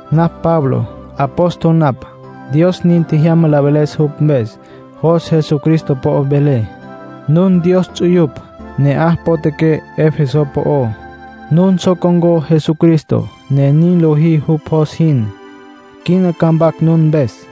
Napj Pablo. Apóstol napj. Dios nin tjejyama la veles jupj mpes. Jos Jesucristo po'o velé. Nun Dios ts'uyupj, ne'aj potjaqué Efeso po'ó. Nun so con̈có Jesucristo, ne nin lojí jupj jos jin. Quina ca mpac nun mpes.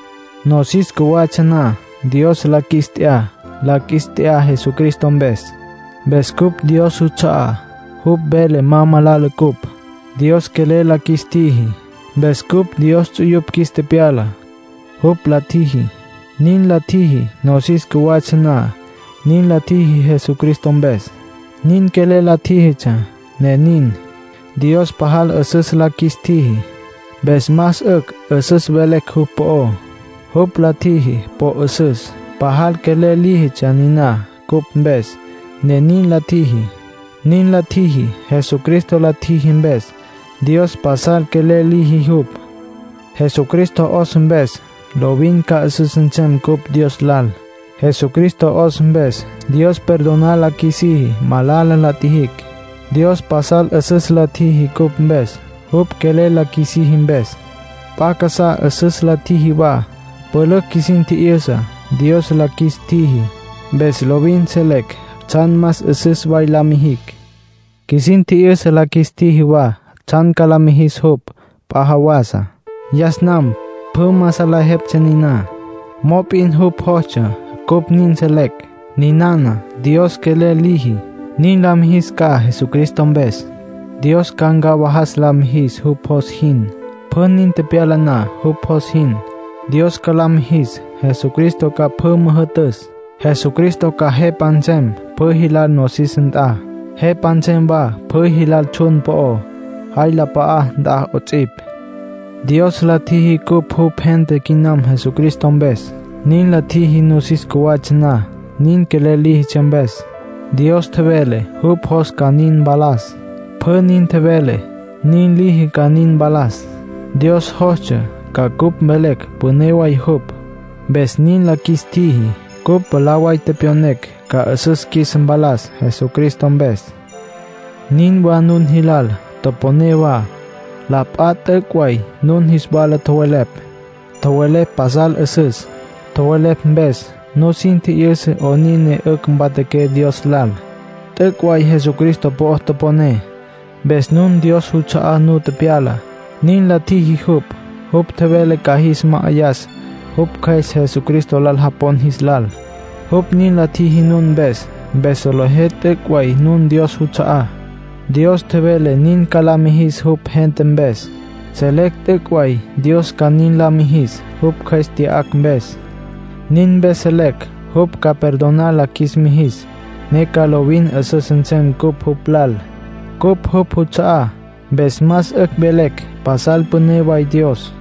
Nosis cjuwatsja na, Dios la qjuis t'ya. La qjuis t'ya Jesucristo mpes. Mpes cupj Dios juts'a'á. Jupj vele ma malala ncupj. Dios quelel la qjuis tjiji, mpes cupj Dios ts'uyupj qjuis tepyala, jupj la tjiji. Nin la tjiji nosis cjuwatsja na. Nin la tjiji Jesucristo mpes. Nin quelel la tjíjitsja, ne nin. Dios pajal 'üsüs la qjuis tjiji, mpes más 'ücj 'üsüs velecj jupj po'ó. Jupj la tjiji po 'üsüs. Pajal quelel líjitsja niná cupj mpes, ne nin la tjiji. Nin la tjiji Jesucristo la tjiji mpes. Dios pasal quelel liji jupj. Jesucristo 'os mpes, lovin ca 'üsüs nsem cupj Dios lal. Jesucristo 'os mpes, Dios perdonar la qjuisiji malala la tjijicj. Dios pasal 'üsüs la tjiji cupj mpes jupj quelel la qjuisiji mpes. P'a casá 'üsüs la tjiji wa. Pülücj qjuisin tji'yüsa, Dios la qjuis tjiji. Mpes lovin selecj tsjan más 'üsüs way la mijicj. Qjuisin tji'yüsa la qjuis tjiji wa tsjan ca la mijis jupj p'a jawasa. Yas nam pjü ma salejeptsja niná. Mop'in jupj jostsja cupj nin selecj. Ninana Dios quelel liji, nin la mijis ca Jesucristo mpes. Dios ca ncawajas la mijis jupj jos jin, pjü nin tepyala na jupj jos jin. Dios ca la mijis Jesucristo ca pjü müjü'tüs. Jesucristo ca Jepa nsem pjü jilal nosis nt'a, Jepa nsem wa pjü jilal tsjun po'ó, jay la p'a'á nt'a 'ots'ipj. Dios la tjiji cupj jupj gente quinam Jesucristo mpes. Nin la tjiji nosis cjuwatsja na, nin quelel líjitsja mpes. Dios tjevele jupj jos ca nin mpalas. Pjü nin tjevele, nin liji ca nin mpalas. Dios jostsja ca cupj mvelecj püné way jupj, mpes nin la qjuis tjiji. Cupj mwalá way tepyonecj ca 'üsüs qjuis mpalas Jesucristo mpes. Nin wa nun jilal. Toponé wa. La p'a t'üc' way nun jis wala tjowelepj. Tjowelepj pasal 'üsüs. Tjowelepj mpes, nusin tji'yüsa 'onin ne 'ücj mpatjaqué Dios lal. T'üc' way Jesucristo po'o toponé. Mpes nun Dios juts'a'á nu tepyala, nin la tjiji jupj. Jupj tjevele ca jis ma'ayas jupj Cjües Jesucristo lal japon jis lal. Jupj nin la tjiji nun mpes, mpes solejé t'üc' way nun Dios juts'a'á. Dios tjevele nin ca la mijis jupj gente mpes. Selecj t'üc' way Dios ca nin la mijis, jupj Cjües tya'acj mpes. Nin mpes selecj jupj ca perdonar la qjuis mijis, ne ca lovin 'üsüs nsem cupj jupj lal. Cupj jupj juts'a'á. Mpes más 'ücj velecj pasal püné way Dios.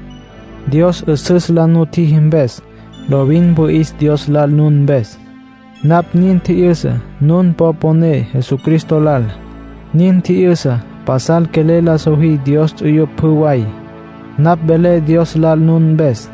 Dios 'üsüs la nutjiji mpes, lovin wüi'is Dios lal nun mpes. Napj nin tji'yüsa nun po poné Jesucristo lal. Nin tji'yüsa pasal quelel la sojí Dios ts'uyupj pjü way. Napj velé Dios lal nun mpes.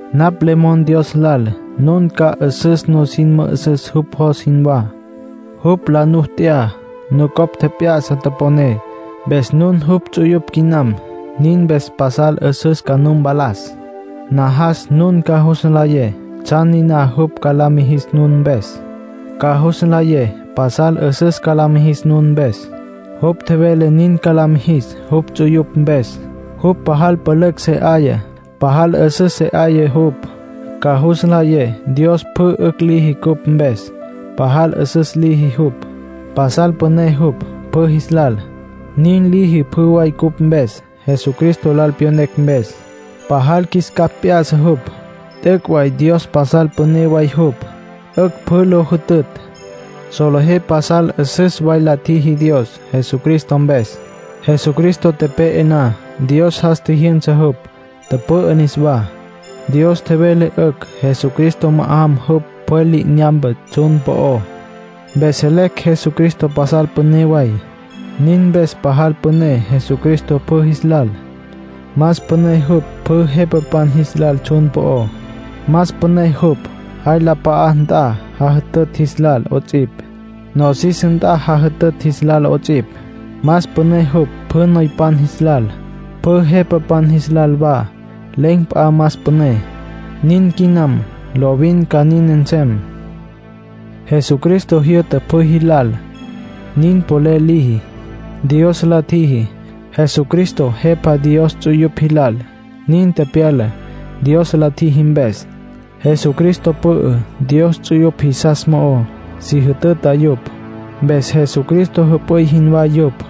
Napj le mon Dios lal nun ca 'üsüs nusin mü'üsüs jupj jos jinwá. Jupj la nu t'ya, nucopj tjep'ya'sa toponé, mpes nun jupj ts'uyupj quinam. Nin mpes pasal 'üsüs ca nu mpalas. Najas nun ca jus nlayé tsjan niná jupj ca la mijis nun mpes. Ca jus nlayé pasal 'üsüs ca la mijis nun mpes. Jupj tjevele nin ca la mijis jupj ts'uyupj mpes. Jupj pajal pülücj se 'aya, pajal 'üsüs se 'aya jupj. Ca jus nlayé Dios pjü 'ücj liji cupj mpes, pajal 'üsüs liji jupj. Pasal püné jupj pjü jis lal. Nin liji pjü way cupj mpes, Jesucristo lal pyonecj mpes. Pajal qjuis capj p'ya'sa jupj. T'üc' way Dios pasal püné way jupj, 'ücj pjü lo jütütj. Solejé pasal 'üsüs way la tjiji Dios Jesucristo mpes. Jesucristo tepe'e na, Dios jas tjijyünsa jupj, tüpü'ü niswá. Dios tjevele 'ücj Jesucristo ma'ajam jupj pjwel li'inyampe tsjun po'ó, mpes selecj Jesucristo pajal püné way. Nin mpes pajal püné Jesucristo pjü jis lal. Más püné jupj pjü jepapan jis lal tsjun po'ó, más püné jupj jay la p'a'a nt'a jajütütj jis lal 'ots'ipj, nosis nt'a jajütütj jis lal 'ots'ipj. Más püné jupj pjü noypan jis lal, pjü jepapan jis lal wa. Len̈ p'a más püné. Nin quinam. Lovin ca nin nsem. Jesucristo jyü'ta pjü jilal. Nin polel liji, Dios la tjiji. Jesucristo Jepa Dios ts'uyupj jilal; nin tepyala, Dios la tjiji mpes. Jesucristo pü'ü Dios ts'uyupj jisas mo'ó, si jütüta yupj; mpes Jesucristo jüp'üy jinwá yupj.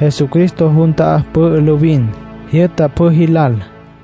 Jesucristo jun ta'á pü'ü lovin. Jyü'ta pjü jilal.